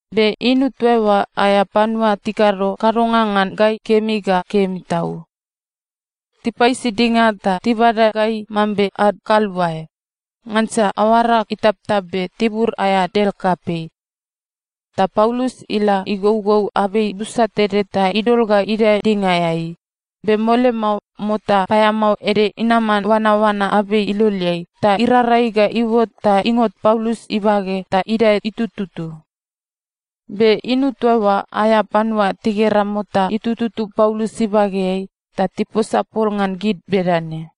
Be inu toa oa aea panua tikado kadonga ngan gai kemi ga kemi tau. Tipaisi dinga ta tibada gai mambe ad kaluae, ngansa aoara itaptap be tibur aea del kapei. Ta Paulus ila igougou abei busa tede ta idol ga idae dingaeai, be mole mao mota paeamao ede inaman oanaoana abei iloleai ta irarai ga iuot ta ingot Paulus ibage ta idae itututu. Be inu toa oa aea panua tigera mota itututu Paulus ibageai, ta tiposa pol ngan gid bedane,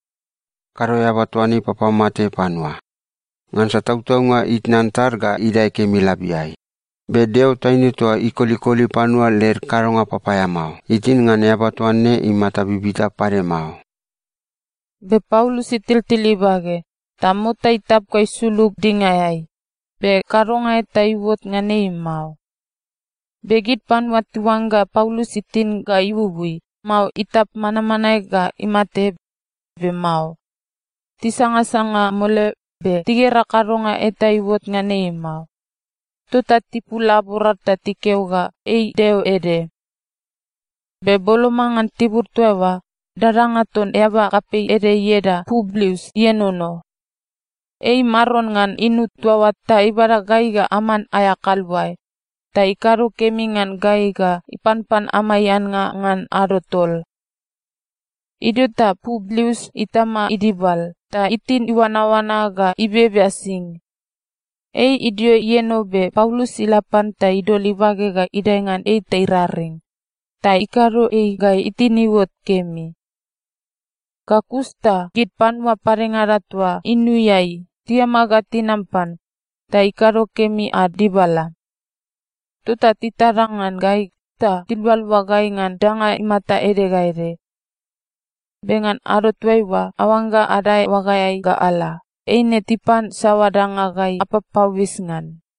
“Kado eaba toa ne ipapamate panua. Ngansa tautaunga itnan tad ga idae kemi labiai, be deo taine toa ikolikoli panua led kadonga papaeamao, itin ngan eaba toa ne imata bibita pade mao.” Be Paulus itiltil ibage, ta mota itap ga isulug dingaeai, be kadonga eta iuot ngan ei mao. Be gid panua tiuangga Paulus itin ga iuui, mao itap manmanae ga imate, be mao. Tisangasanga mole be tigera kadonga eta iuot ngan ei mao, tota tipul laborad ta tikeo ga ei deo ede. Be boloma ngan tibur toa oa, dadanga ton eaba kapei ede ieda Publius ienono. Ei maron ngan inu toa oa ta ibada gai ga aman aea kaluae, ta ikado kemi ngan gai ga ipanpan amai annga ngan ado tol. Idio ta Publius itama idibal ta itin iuanaoana ga ibebea sing. Ei idio ienono, be Paulus ila pan ta idol ibage ga idae ngan ei ta iraring, ta ikado ei ga itin iuot kemi. Ga kus ta gid panua padengada toa inuiai tiama ga tinam pan, ta ikado kemi ad dibala. Tota titada ngan gai ta tilualua gai ngan danga imata ede ga ede. Be ngan ado toaiua aoangga adae oagaeai ga ala, eine tipan saoa danga gai apapauis ngan.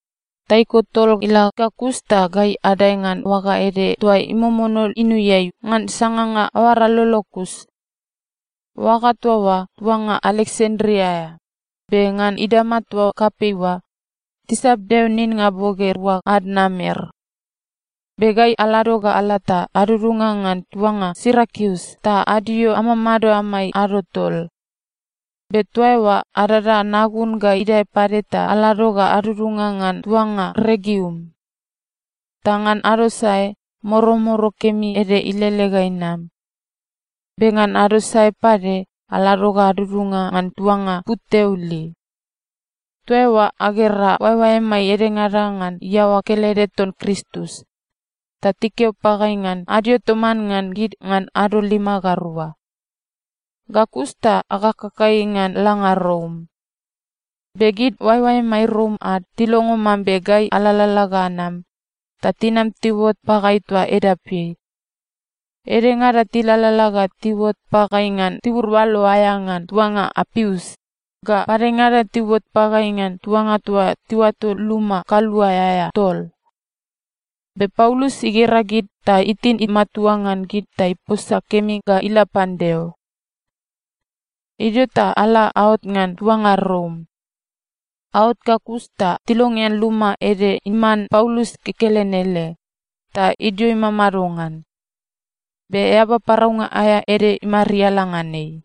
Taiko tol ila ga kus ta gai adae ngan oaga ede toa imomono inuiai ngan sanganga aoara lolo kus. Oaga toa oa tuanga Aleksandria aea, be ngan idama toa kapei oa tisap deo ninnga boge rua ad namer. Be gai alado ga ala ta adudunga ngan tuanga Sirakius ta adio amamado amai ado tol. Be toa eoa adada nagun ga idae pade ta alado ga adudunga ngan tuanga Regium. Ta ngan ado sae, moromoro kemi ede ilele ga inam. Be ngan ado sae pade, alado ga adudunga ngan tuanga Puteoli. Toa eoa agera oaeoaemai edengada ngan iaoa kelede ton Kristus, ta tikeo pagai ngan adio toman ngan gid ngan ado lima ga rua. Ga kus ta akakagai ngan langa Rom. Be gid oaeoaemai Rom ad tilongo mambe gai alalala ga anam, ta tinam tiuot pagai toa edapeai. Edengada tilalala ga tiuot pagai ngan tibur oalo aea ngan tuanga Apius, ga padengada tiuot pagai ngan tuanga toa tiuato Luma Kaluae aea Tol. Be Paulus igera gid ta itin imatua ngan gid ta iposa kemi ga ila pan Deo. Idio ta ala aot ngan tuanga Rom. Aot ga kus ta tilongean luma ede iman Paulus kekelen ele, ta idio imamado ngan. Be eaba paraunga aea ede imariala ngan ei.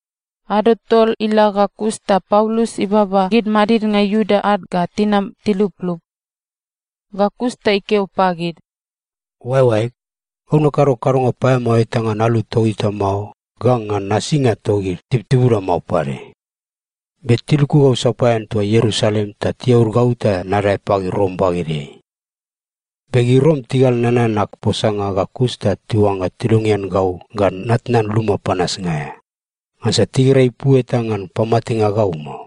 Ado tol ila ga kus ta Paulus ibaba gid madidnga Iuda ad ga tinam tiluplup. Ga kus ta ikeo pagid, “Oaeoaeg, gau nakado kadonga paeamao eta ngan alu togita mao ga ngan nasinga togid tibutibuda mao pade. Be tiluku gau sapaean toa Ierusalem ta tiaud gau ta nadae pagid Rom bagedeai. Be gid Rom tigal nanan ag posanga ga kus ta tiuangga tilongean gau ga natnan luma panasnga aea, ngansa tigera ipu eta ngan pamatenga gau mao.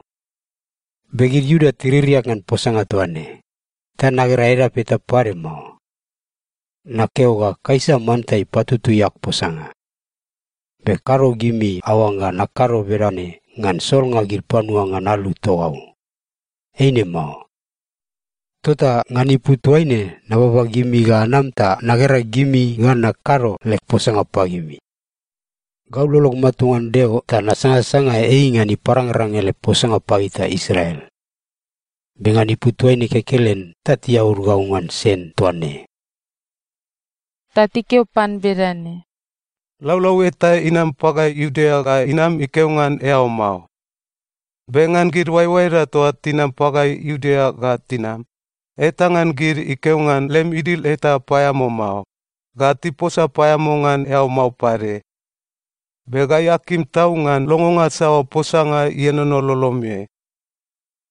Be gid Iuda tiririak ngan posanga toa ne, ta nagera edap eta pade mao. Nakeo ga Kaisa manta ipatutui ag posanga. Be kado gimi aoangga nakado bedane ngan solnga gid panua ngan alu togau. Eine mao. Tota ngan ipu toaine nababa gimi ga anam ta nagera gimi ga nakado leg posanga pagimi. Gau lolog matua ngan Deo ta nasangasanga ei ngan iparangrang ele posanga pagita Israel. Be ngan ipu toaine kekelen ta tiaud gau ngan sen toa ne.” Ta tikeo pan bedane, “Laulau eta inam pagai Iudea ga inam ikeo ngan eao mao. Be ngan gid oaeoaeda toa tinam pagai Iudea ga tinam, eta ngan gid ikeo ngan lem idil eta paeamao mao, ga tiposa paeamao ngan eao mao pade. Be gai akim tau ngan longonga saoa posanga ienono lolomeai.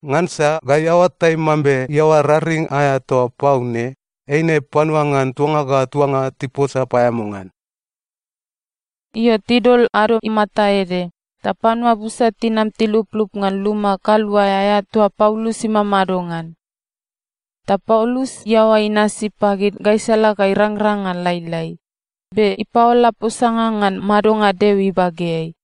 Ngansa gai aoatai mambe iaoa raring aea toa pau ne, eine panua ngan tuanga ga tuanga tiposa paeamao ngan.” Io, tidol ado imata ede, ta panua busa tinam tiluplup ngan luma kaluae aea toa Paulus imamado ngan. Ta Paulus iaoa inasi pagid gaisala ga irangrang ngan lailai, be ipaola posanga ngan madonga Deo ibageai.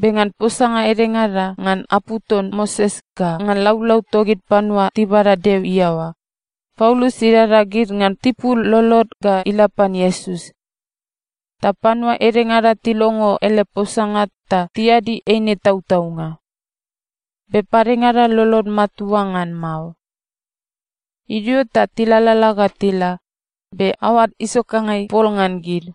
Be ngan posanga edengada ngan apu ton Moses ga ngan laulau togid panua tibada Deo iaoa, Paulus idada gid ngan tipul lolod ga ila pan Iesus. Ta panua edengada tilongo ele posanga ta tiadi eine tautaunga. Be padengada lolod matua ngan mao. Idio ta tilalala ga tila, be aoad isokangai pol ngan gid.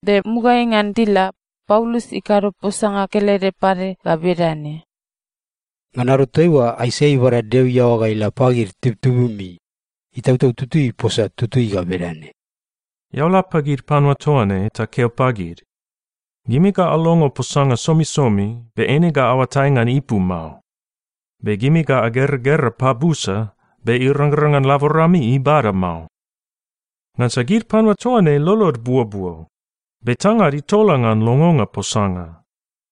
Be mugaeai ngan tila, Paulus ikado posanga kelede pade ga bedane, “Ngan ado toaiua Aisaia ibada Deo iaoa ga ila pagid tibutibumi, Itautau Tutui iposa tutui ga bedane, “‘Eao la pagid panua toa ne ta keo pagid, “Gimi ga alongo posanga somisomi, be eine ga aoatai ngan ipu mao. Be gimi ga ageragera pabusa, be irangrang ngan laborami ibada mao.” Ngansa gid panua toa ne lolod buobuo. Be tangad itola ngan longonga posanga.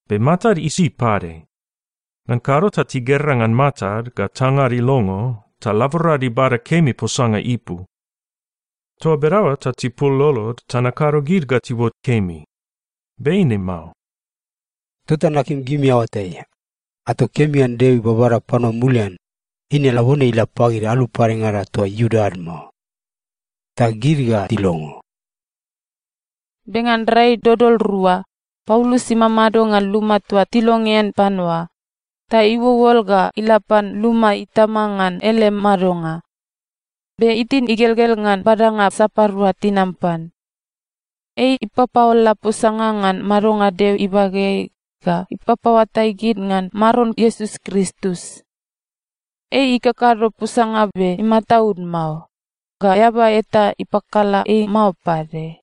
Be matad isi pade. Ngan kado ta tigera ngan matad ga tangad ilongo, ta laborad ibada kemi posanga ipu. Toa bedaoa ta tipul lolod ta nakado gid ga tiuot kemi. Be eine mao.’ “Tota nakim gimi aoatai, ato kemi ngan Deo ibabada panua mulian, eine labone ila pagid alu padengada toa Iuda ad mao. Ta gid ga tilongo.” Be ngan rai dodol rua, Paulus imamado ngan luma toa tilongean pan oa, ta iuolol ga ila pan luma itama ngan ele madonga. Be itin igelgel ngan badanga sapadua tinam pan. Ei ipapaola posanga ngan madonga Deo ibageai ga ipapaoatai gid ngan Maron Iesus Kristus. Ei ikakado posanga be imataud mao, ga eaba eta ipakala ei mao pade.